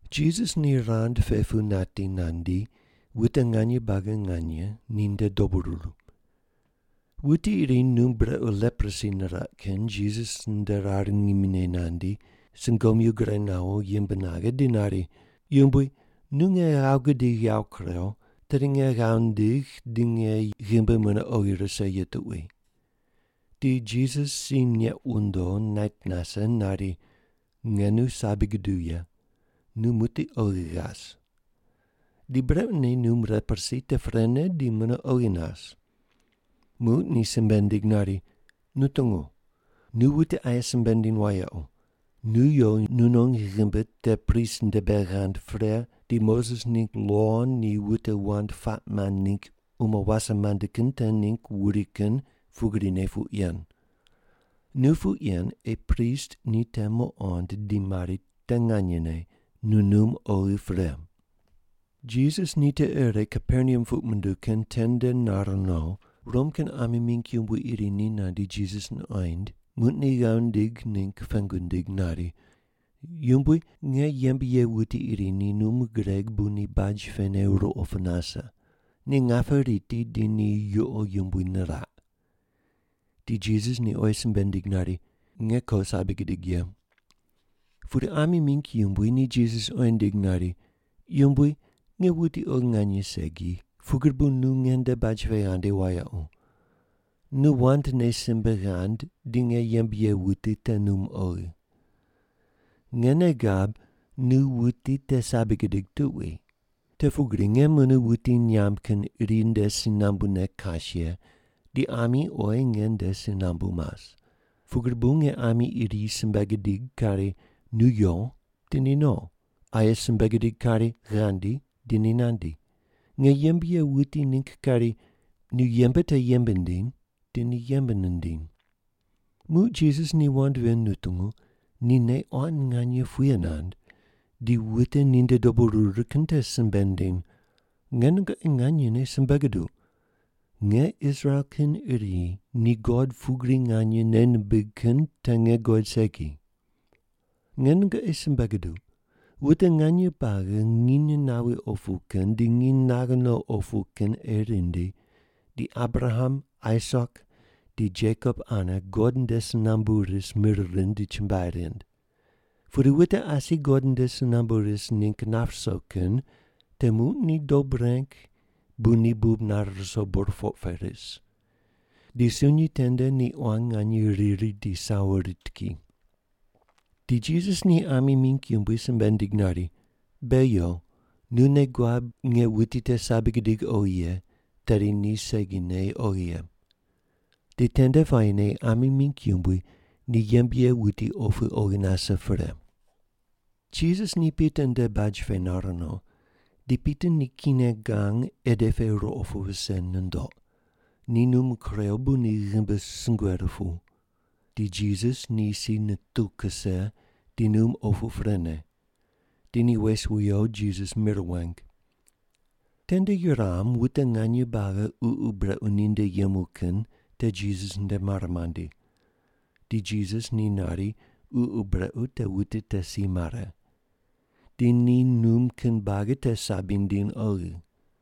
Jisas ni rand pe pu nati nandi, wute nganye buagi nganye ninde dobu ruru. Wuti iri num brequ leprosi niraq kin Jisas nde rar ngimi nandi, sungomyu gure nawo, yimb naghe, di nari, “Yumbui, nu nge ghav gudigh yawo kurew, tedi nge ghav ndigh di nge ghimbi mune oghi rise ye tuqui.” Di Jisas si neq wundo nait nase nari, “Nge nu sabi guduw ye. Nu muqdi oghi ghas!” Di brequne num leprosi te prene di mune oghi nas. Muq ni simbe nindig nari, “Nu tungu! Nu wute aye simbe ndiny wayequ, nu yo nunon ghimbi te prist nde bei ghand pre, di Moses ningg lo ni wute wand puaq mand ningg umo wase mande kin te ningg wuri kin pugrine puq yen. Nu puq yen ei prist ni te muqond di mari te nganyene nu num oghi pre.” Jisas ni tiqe ire Kaperneam puq munduw kin tende nar no, Rom kin ami mingg yumbui iri ni nandi Jisas nuqoind, muq ni ghav nindig ningg pengu nindig nari, “Yumbui, nge yembe ye wuti iri ni num gureg bu ni baj pene ruqo pu nase. Ni ngape riti di ni yuqo yumbui niraq.” Di Jisas ni oyi simbe nindig nari, “Nge ko, sabi gidig ye.” Pudi ami mingg yumbui ni Jisas oyi nindig nari, “Yumbui, nge wuti oghi nganye segi, pugri bu nu ngende baj pe ghandi wayequ. Nu wandne simbe ghand, di nge yembe ye wuti te num oghi. Nge nei gab nu wuti te sabi gudig tuqui. Te pugri nge mune wuti nyamb kin iri nde si nambune kas ye, di ami oyi nge nde si nambu mas. Pugri bu nge ami iri simbe gidig kari, ‘Nu yo,’ di ni no; aye simbe gidig kari, ‘Ghandi,’ di ni nandi; nge yembe ye wuti ningg kari, ‘Nu yembe te yembe ndiny,’ di ni yembe nindiny.” Muq Jisas ni wand ven nutungu, ni nei quan nganye puye nand, di wute ninde dobu ruru kin te simbe nindiny, “Nge nungoqi nganyene simbe guduq, nge Israel kin iri ni God pugri nganye nei nimbig kin te nge guqoid segi. “Nge nungoqi simbe guduq, wute nganye buagi nginy nawi opu kin di nginy naghe no opu kin ei rindi, di Abraham, Aisak di Jekop ane God nde si nambu ris mir rind di chumbuai rind. Pudi wute asi God nde si nambu ris ningg nap ruso kin te muq ni dob reng bu ni bub nare ruso burpoq pe ris. Di sunyi tende ni quan nganye riri di sawo rit ki.” Di Jisas ni ami mingg yumbui simbe nindig nari, “Be yo. Nu nei guab nge wuti te sabi gidig oghi ye, tedi ni segine oghi ye.” Di tende puayine ami mingg yumbui ni yembe ye wuti opu oghi nase pre. Jisas ni Pita nde baj pe nar no, di Pita ni kine gang ede pe ruqo pu wuse nundoq, ni num kurew bu ni ghimbi sungue rupuw. Di Jisas ni si nituw kuse, di num opu prene. Di ni wes wiyo, Jisas mir weng. Tende yuram wute nganye buagi ququ brequ ninde yemu kin te Jisas nde mare mandi. Di Jisas ni nari, ququ brequ te wute te si mare. Di ni num kin buagi te sabi nindiny oghi.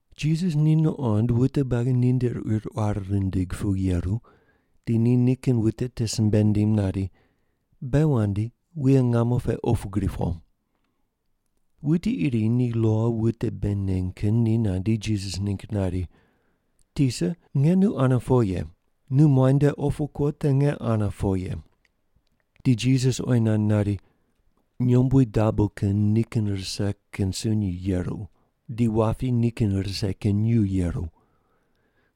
Jisas ni nuqond wute buagi ninde quir quar rindig pu yeru, di ni nikin wute te simbe nindim nari, “Be wandi, wuye ngamo pe opu gri po.” Wuti iri ni lo wute bei neny kin ni nandi, Jisas ningg nari, “Tisa, nge nu ane po ye. Nu muainde opu kuo te nge ane po ye.” Di Jisas oyi nand nari, “Nyombui dabo kin nikin rise kin sunyi yeru, di wapi nikin rise kin nyuw yeru.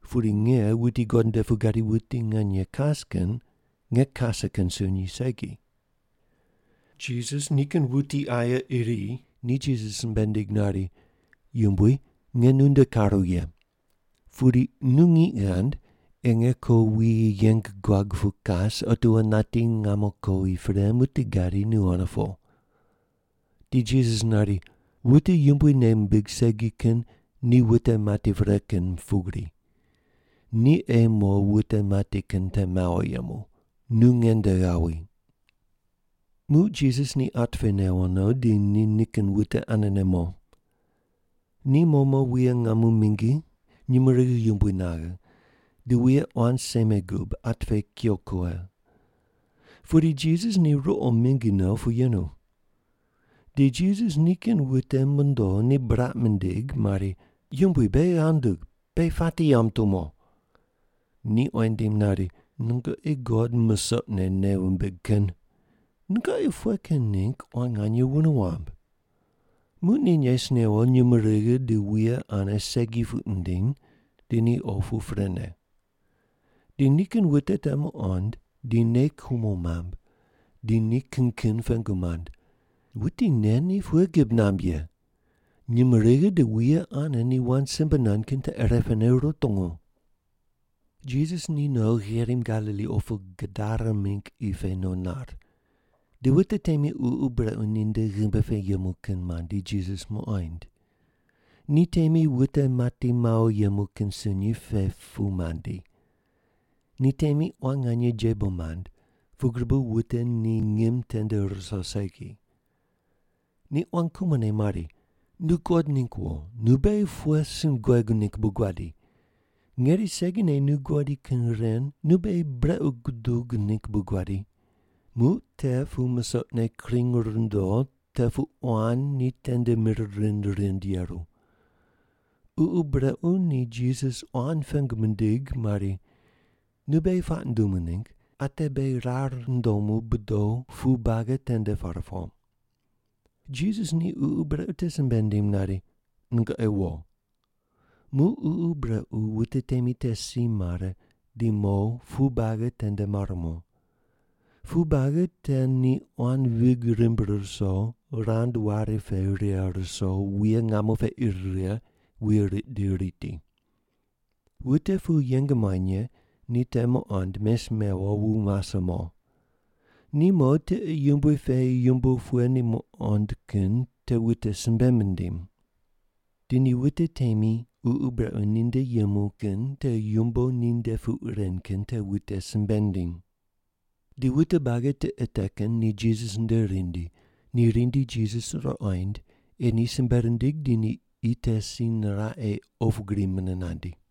Pudi nge, wuti God nde pu gadi wuti nganye kas kin, nge kase kin sunyi segi.” Jisas nikin wuti aye iri ni Jisas simbe nindig nari, “Yumbui, nge nunde karu ye. Pudi nu ngiq ghand ei nge ko wuyi yeng guag pu kas, otiwo nati ngamo kowi pre muqdi gadi nu ane po.” Di Jisas nari, “Wute Yumbui nei mimbig segi kin ni wute mati pre kin pugri. Ni ei mo wute mati kin te mawo yemu. Nu nge nde ghawi.” Muq Jisas ni at pe newo no, di ni nikin wute anene mo. Ni mo mo wuye ngamo mingi nyumurighi yumbui naghe, di wuye quan seme gub, at pe kuyo kughe. Pudi Jisas ni ruqo mingi no pu yenu. Di Jisas nikin wute mondo, ni buraq mindig mari, “Yumbui, beghi ghav ndug! Beghi pati yamb tumo!” Ni oyi nindim nari, “Nungoqi God musoqne nei wumbig kin, nungoqi pughe kin ningg quan nganye wune wamb?” Muq ni nes newo nyumurighi di wuye ane segi puq nindiny, di ni opu prene. Di nikin wute te muqond, di nei kumo mamb, di ni kin kin pengu mand, “Wuti nen ni pughe gib namb ye? Nyumurighi di wuye ane ni wand simbe nand kin te irepene rutungu!” Jisas ni no gherim Galili opu Gadara mingg qi pe no nar. Di wute temi ququ brequ ninde ghimbi pe yemu kin mandi, Jisas muqoind. Ni temi wute mati mawo yemu kin sunyi pe pu mandi. Ni temi quan nganye jebo mand, pugri bu wute ni ngim tende ruso segi. Ni quan kumone mari, “Nu God ningg wo, nu beghi pughe sin guegu ningg bu guadi? Ngeri segine nu guadi kin ren nu beghi brequ gudug ningg bu guadi?” Muq te pu musoqne kring rundo te pu quan ni tende mir rind rind yeru. Ququ brequ ni Jisas quan pengu mindig mari, “Nu beghi puaq ndumu ningg, ate beghi rar ndomu bodo pu buagi tende par po.” Jisas ni ququ brequ te simbe nindim nari, “Nungoqi wo.” Muq ququ brequ wute temi te si mare, di mo pu buagi tende mar mo. Pu buagi te ni quan vig rimb ruso, rand wari pe righe ruso, wuye ngamo pe ir righe, wuye riq di riti. Wute pu yeng muany ye ni te muqond, mes mewo, wu mase mo. Ni mo, tiqe yumbui pe yumbo pughe ni muqond kin te wute simbe mindiny. Di ni wute temi ququ brequ ninde yemu kin te yumbo ninde puq ren kin te wute simbe mindiny. Di wute buagi tiqe te kin ni Jisas nde rindi. Ni rindi Jisas ruqoind ei ni simbe rindig di ni qi te si niraq ei opu gri mune nandi.